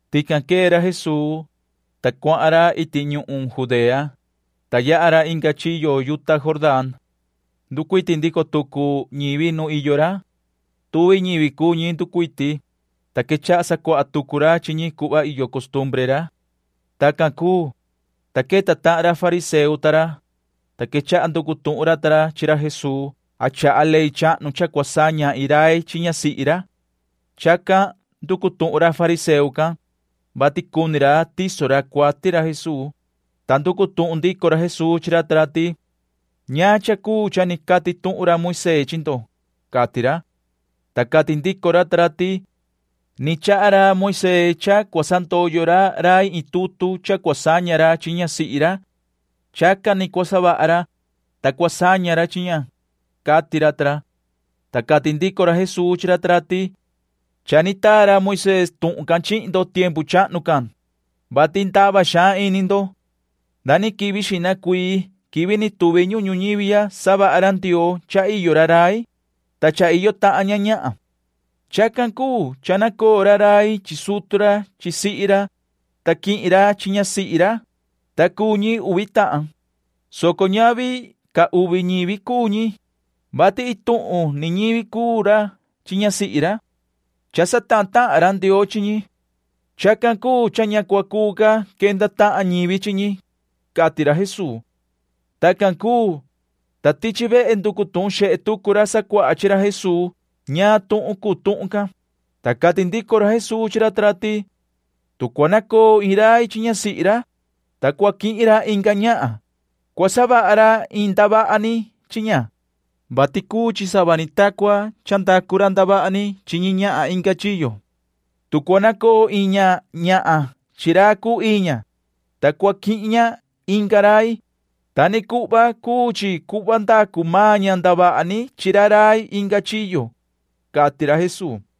Tican quee ra Jesuu, ta cuahan ra iti ñuhun Judea, ta yaha ra inga chiyo yuta Jordán. Nducuiti ndico tucu ñivi nuun iyo ra. Tuvi ñivi cuu ñi nducuiti, ta quechaha sacuaha tucu ra chi ñi cuhva iyo costumbre ra. Tacan cuu, ta queta tahan ra fariseo ta ra, ta quechaha nducu tuhun ra ta ra chi ra Jesuu a chaha ley chahnu cha cua saña iin rai chi ñasihi ra. Chacan nducu tuhun ra fariseo can, vati cuni ra tiso ra cuati ra Jesuu, ta nducu tuhun ndico ra Jesuu chi ra ta ra ti: ―¿Ñaan cha cuu cha ni cati tuhun ra Moisee chi ndo? ―cati ra. Ta cati ndico ra ta ra ti: ―Ni chaha ra Moisee cha cua sandoyo ra rai iin tutu cha cua saña ra chi ñasihi ra. Chacan ni cua savaha ra, ta cua saña ra chi ña ―cati ra ta ra. Ta cati ndico ra Jesuu chi ra ta ra ti: ―Cha ni taa ra Moisee tuhun can chihin ndo tiempu chahnu can, vati ndava xaan ini ndo. Nda ni quivi xihna cuii quivi ni tuvi ñuhun ñuñivi ya savaha ra Ndioo cha iyo ra rai, ta cha iyo tahan ña ñahan. Chacan cuu cha nacoo ra rai chi sutu ra chi sihi ra, ta quihin ra chi ñasihi ra, ta cuu ñi uvi tahan, soco ñavi ca uvi ñivi cuu ñi, vati iin tuhun ni ñivi cuu ra chi ñasihi ra. Cha satahan tahan ra Ndioo chi ñi. Chacan cuu cha ña cua cuu ca quenda tahan ñivi chi ñi ―cati ra Jesuu. Tacan cuu, ta tichi vehe nducu tuhun xehe tucu ra sacuaha chi ra Jesuu ñaan tuhun cuu tuhun can, ta cati ndico ra Jesuu chi ra ta ra ti: ―Tu cua nacoo iin rai chi ñasihi ra, ta cua quihin ra inga ñahan, cua savaha ra iin ndavaha ni chi ña, vati cuu chi sava ni ta cua ndacu maan ra ndavaha ni chi ñi ñahan inga chiyo. Tu cua nacoo iin ñahan chi ra cuu ii ña, ta cua quihin ña inga rai, ta ni cuhva cua cuu chi cuhva ndacu maan ña ndavaha ni chi ra rai inga chiyo ―cati ra Jesuu.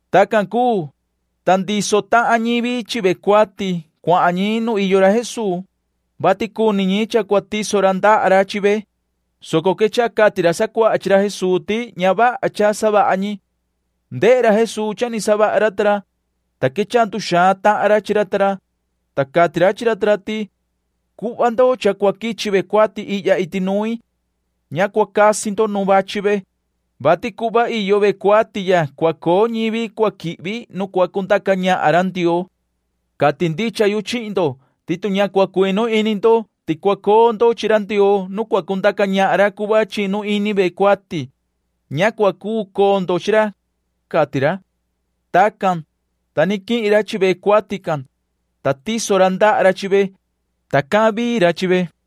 Tacan cuu, ta ndiso tahan ñivi chi ve cuati cuahan ñi nu iyo ra Jesuu, vati cuni ñi cha cua tiso ra ndaha ra chi ve, soco quechaha cati ra sacuaha chi ra Jesuu ti ña vaha cha savaha ñi. Ndehe ra Jesuu cha ni savaha ra ta ra, ta quechaha nduxaan tahan ra chi ra ta ra, ta cati ra chi ra ta ra ti: ―Cuhva ndo cha cua quichi ve cuati ihya iti nuin. Ña cua casi ndo nu vachi ve, vati cuhva iyo ve cuati ya cua coo ñivi cua quihvi nu cua cundaca ñahan ra Ndioo. Cati ndicha yu chihin ndo ti tu ña cua cuinu ini ndo ti cua coo ndo chi ra Ndioo nu cua cundaca ñahan ra cuhva chinu ini ve cuati, ña cua cuu coo ndo chi ra ―cati ra. Tacan, ta ni quihin ra chi ve cuati can, ta tiso ra ndaha ra chi ve, ta cahan vii ra chi ve.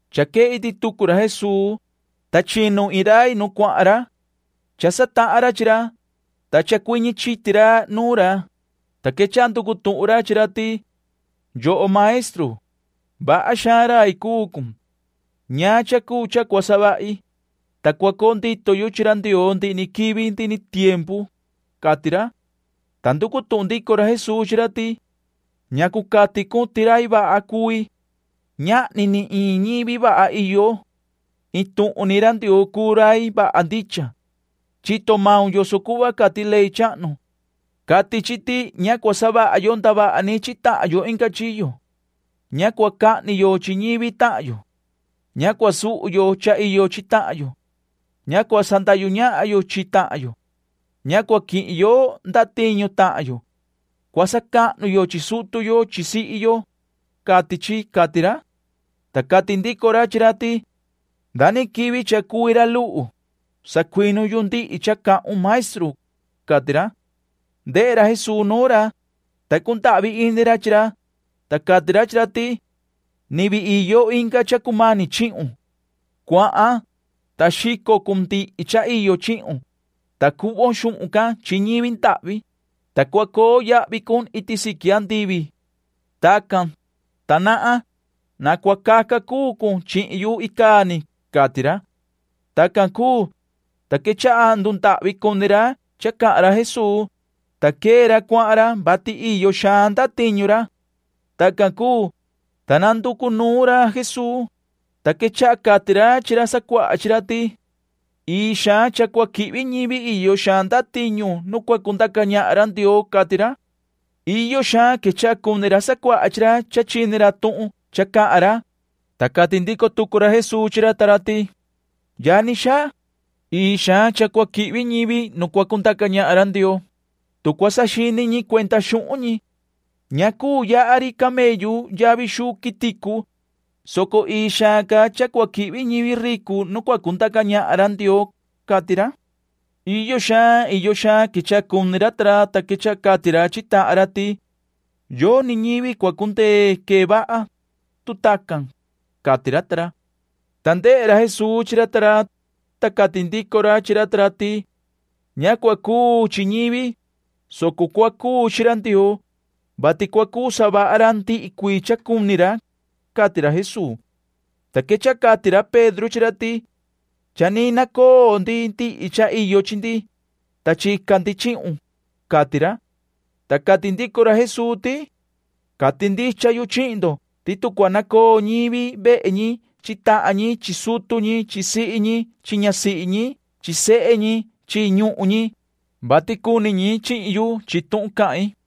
Cha quee iti tucu ra Jesuu, ta chinu iin rai nu cuahan ra. Cha satahan ra chi ra, ta chacuiñi chiti ra nuun ra, ta quechaha nducu tuhun ra chi ra ti: ―Yoho maestru, vaha xaan rai cuu cun. ¿Ñaan cha cuu cha cua savahi, ta cua coo ndito yu chi ra Ndioo ndihi ni quivi ndihi ni tiempu? ―cati ra. Ta nducu tuhun ndico ra Jesuu chi ra ti: ―¿Ñacu cati cun ti rai vaha cui? Ñahni ni iin ñivi vaha iyo. Iin tuhun ni ra Ndioo cuu rai vaha ndicha. Chito maun yoso cuhva cati ley chahnu. Cati chi ti ña cua savaha yo ndavaha ni chi tahan yo inga chiyo. Ña cua cahni yo chi ñivi tahan yo. Ña cua suhu yo cha iyo chi tahan yo. Ña cua sandahyu ñahan yo chi tahan yo. Ña cua quihin yo ndatiñu tahan yo. Cua sacahnu yo chi sutu yo chi sihi yo, cati chi ―cati ra. Ta cati ndico ra chi ra ti: ―Nda quivi cha cui ra luhu, sacuinu yu ndihi cha cahun, maestru ―cati ra. Ndehe ra Jesuu nuun ra, ta cundahvi ini ra chi ra, ta cati ra chi ra ti: ―Ni vii iyo inga cha cumani chihun. Cuahan, ta xico cun ndihi cha iyo chihun, ta cuhvon xuhun can chi ñivi ndahvi, ta cua coo yahvi cun iti siqui andivi. Tacan, ta nahan. Na cua caca cuu cun chihin yu icaa ni ―cati ra. Tacan cuu, ta quechaha ndundahvi cuni ra cha cahan ra Jesuu, ta quee ra cuahan ra, vati iyo xaan ndatiñu ra. Tacan cuu, ta nanducu nuun ra Jesuu, ta quechaha cati ra chi ra sacuaha chi ra ti: ―Ii xaan cha cua quihvi ñivi iyo xaan ndatiñu nu cua cundaca ñahan ra Ndioo ―cati ra. Iyo xaan quechaha cuni ra sacuaha chi ra cha chini ra tuhun cha cahan ra, ta cati ndico tucu ra Jesuu chi ra ta ra ti: ―Yani xaa, ii xaan cha cua quihvi ñivi nu cua cundaca ñahan ra Ndioo, tu cua saxini ñi cuenda xuhun ñi. Ña cuu yaha ri camellu yavi xuu quiticu, soco ii xaan ca cha cua quihvi ñivi ricu nu cua cundaca ñahan ra Ndioo ―cati ra. Iyo xaan iyo xaan quechaha cuni ra ta ra, ta quechaha cati ra chi tahan ra ti: ―Yoni ñivi cua cundee quee vaha, tu tacan ―cati ra ta ra. Ta ndehe ra Jesuu chi ra ta ra, ta cati ndico ra chi ra ta ra ti: ―Ña cua cuu chi ñivi, soco cua cuu chi ra Ndioo, vati cua cuu savaha ra ndihi cuii cha cuni ra ―cati ra Jesuu. Ta quechaha cati ra Pedro chi ra ti: ―Cha ni nacoo ndi ndihi cha iyo chi ndi, ta chica ndi chihun ―cati ra. Ta cati ndico ra Jesuu ti: ―Cati ndicha yu chihin ndo ti tu cua nacoo ñivi vehe ñi chi tahan ñi chi sutu ñi chi sihi ñi chi ñasihi ñi chi sehe ñi chi ñuhun ñi, vati cuni ñi chihin yu chi tuhun cahin,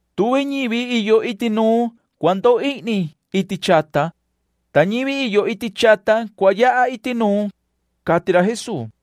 Tuvi ñivi iyo iti nuun cua ndoo ihni iti chata, ta ñivi iyo iti chata cua yaha iti nuun ―cati ra Jesuu.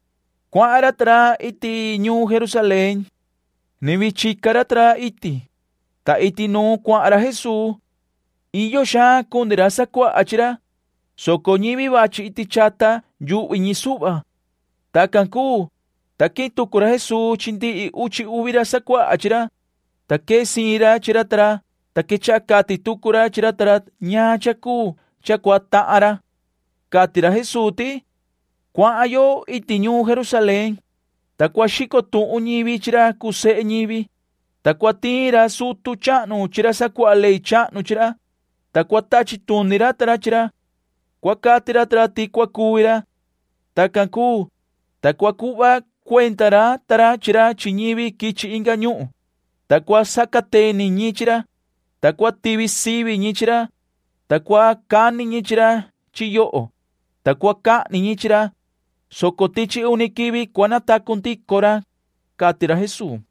Cuahan ra ta ra iti ñuun Jerusalén. Ni vii chica ra ta ra iti, ta iti nuun cuahan ra Jesuu. Iyo xaan cuni ra sacuaha chi ra, soco ñivi vachi iti chata yuhvi ñi suhva. Tacan cuu, ta quihin tucu ra Jesuu chi ndihi uchi uvi ra sacuaha chi ra, ta quee siin ra chi ra ta ra, ta quechaha cati tucu ra chi ra ta ra ñaan cha cuu cha cua tahan ra. Cati ra Jesuu ti: ―Cuahan yo iti ñuun Jerusalén, ta cua xico tuhun ñivi chi ra cuu sehe ñivi, ta cua tiin ra sutu chahnu chi ra sacuaha ley chahnu chi ra, ta cua tachi tuni ra ta ra chi ra. Cua cati ra ta ra ti cua cuvi ra. Tacan cuu, ta cua cuhva cuenda ra ta ra chi ra chi ñivi quichi inga ñuhun, ta cua sacateni ñi chi ra, ta cua tivi sivi ñi chi ra, ta cua cani ñi chi ra chi yoho, ta cua cahni ñi chi ra, soco tichi uni quivi cua natacu ndico ra ―cati ra Jesuu.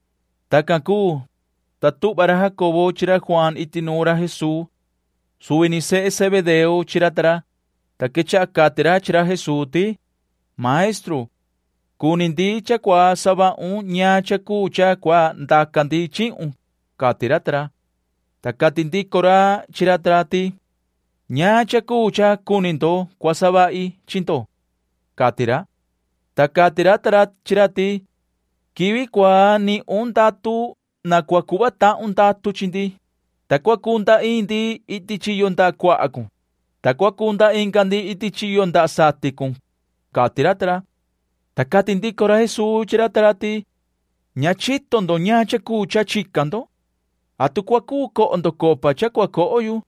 Tacan cuu, ta tuhva ra Jacobo chi ra Juaan iti nuun ra Jesuu. Suvi ni sehe Zebedeo chi ra ta ra, ta quechaha cati ra chi ra Jesuu ti: ―Maestru, cuni ndi cha cua savahun ñaan cha cuu cha cua ndaca ndi chihun ―cati ra ta ra. Ta cati ndico ra chi ra ta ra ti: ―¿Ñaan cha cuu cha cuni ndo cua savahi chi ndo? ―cati ra. Ta cati ra ta ra chi ra ti: ―Quivi cua nihun ndatu na cua cuhva tahun ndatu chi ndi, ta cua cunda iin ndi iti chiyo ndaha cuaha cun, ta cua cunda inga ndi iti chiyo ndaha satin cun ―cati ra ta ra. Ta cati ndico ra Jesuu chi ra ta ra ti: ―Ña chito ndo ñaan cha cuu cha chica ndo. ¿Atu cua cuu coho ndo copa cha cua coho yu?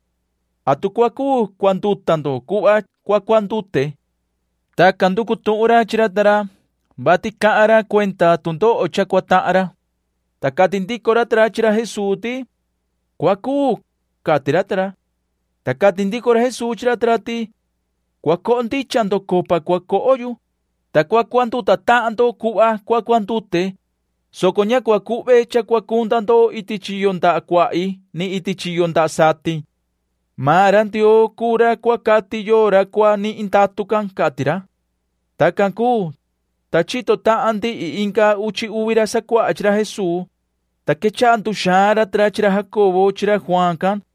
¿Atu cua cuu cuanduta ndo cuhva cua cuandute? [Tacan nducu tuhun ra chi ra ta ra, vati cahan ra cuenda tu ndoho cha cua tahan ra.] Ta cati ndico ra ta ra chi ra Jesuu ti: ―Cua cuu ―cati ra ta ra. Ta cati ndico ra Jesuu chi ra ta ra ti: ―Cua coho ndicha ndo copa cua coho yu, ta cua cuanduta tahan ndo cuhva cua cuandute, soco ña cuu cuhve cha cua cunda ndo iti chiyo ndaha cuahi ni iti chiyo ndaha satin. Maan ra Ndioo cuu ra cua cati yoo ra cua nihin ndatu can ―cati ra. Tacan cuu, ta chito tahan ndihi inga uchi ra sacuaha chi ra Jesuu, ta quechaha nduxaan ra ta ra chi ra Jacobo chi ra Juaan can.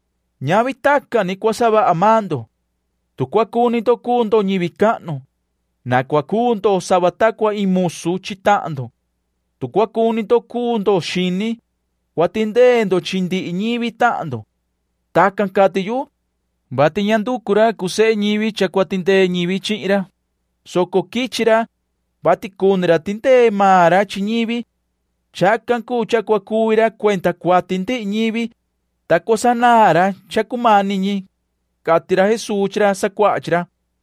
Ñavi tacan ni cua savaha maan ndo. Tu cua cuni ndo cuu ndo ñivi cahnu, na cua cuu ndo sava ta cua iin musu chi tahan ndo. Tu cua cuni ndo cuu ndo xini, cua tindee ndo chi ndihi ñivi tahan ndo. Tacan cati yu, vati ña nducu ra cuu sehe ñivi cha cua tindee ñivi chihin ra, soco quichi ra, vati cuni ra tindee maan ra chi ñivi. Chacan cuu cha cua cuvi ra cuenda cuati ndihi ñivi, ta cua sanaan ra cha cumani ñi ―cati ra Jesuu chi ra sacuaha chi ra.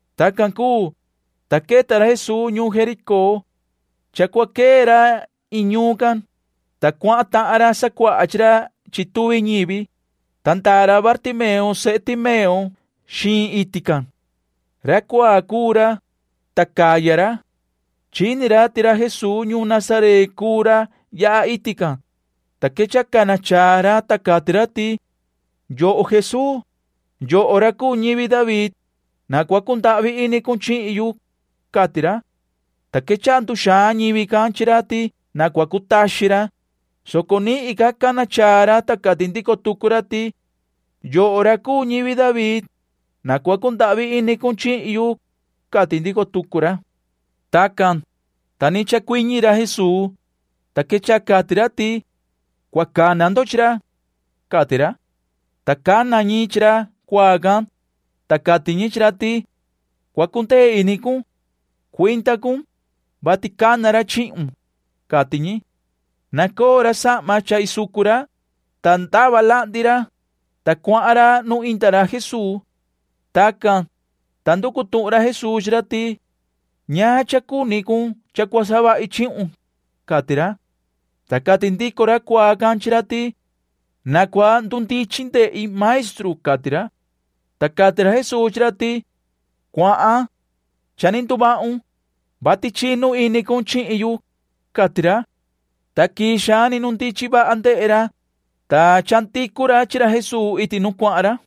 Tacan cuu, ta queta ra Jesuu ñuun Jericó. Cha cua quee ra iin ñuun can, ta cuahan tahan ra sacuaha chi ra chi tuvi ñivi, ta ndaa ra Bartimeo sehe Timeo xiin iti can. Ra cuaa cuu ra, ta caya ra. Chini ra ti ra Jesuu ñuun Nazaret cuu ra yaha iti can, ta quechaha cana chaa ra, ta cati ra ti: ―Yoho Jesuu, yoho ra cuu ñivi David, na cua cundahvi ini cun chihin yu ―cati ra. Ta quechaha nduxaan ñivi can chi ra ti na cua cutaxin ra, soco nihin ca cana chaa ra, ta cati ndico tucu ra ti: ―Yoho ra cuu ñivi David, na cua cundahvi ini cun chihin yu ―cati ndico tucu ra. Tacan, ta ni chacuiñi ra Jesuu, ta quechaha cati ra ti: ―Cua cana ndo chi ra ―cati ra. Ta cana ñi chi ra cuaa can, ta cati ñi chi ra ti: ―Cua cundee ini cun. Cuinda cun, vati cana ra chihun ―cati ñi. Nacoo ra sahma cha isucu ra, ta ndava lahndi ra, ta cuahan ra nu inda ra Jesuu. Tacan, ta nducu tuhun ra Jesuu chi ra ti: ―¿Ñaan cha cuni cun cha cua savahi chihun? ―cati ra. Ta cati ndico ra cuaa can chi ra ti: ―Na cua ndundichin ndehi, maestru ―cati ra. Ta cati ra Jesuu chi ra ti: ―Cuahan. Cha ni nduvahun, vati chinu ini cun chihin yu ―cati ra. Ta quii xaan ni ndundichin vaha ndehe ra, ta chandicu ra chi ra Jesuu iti nu cuahan ra.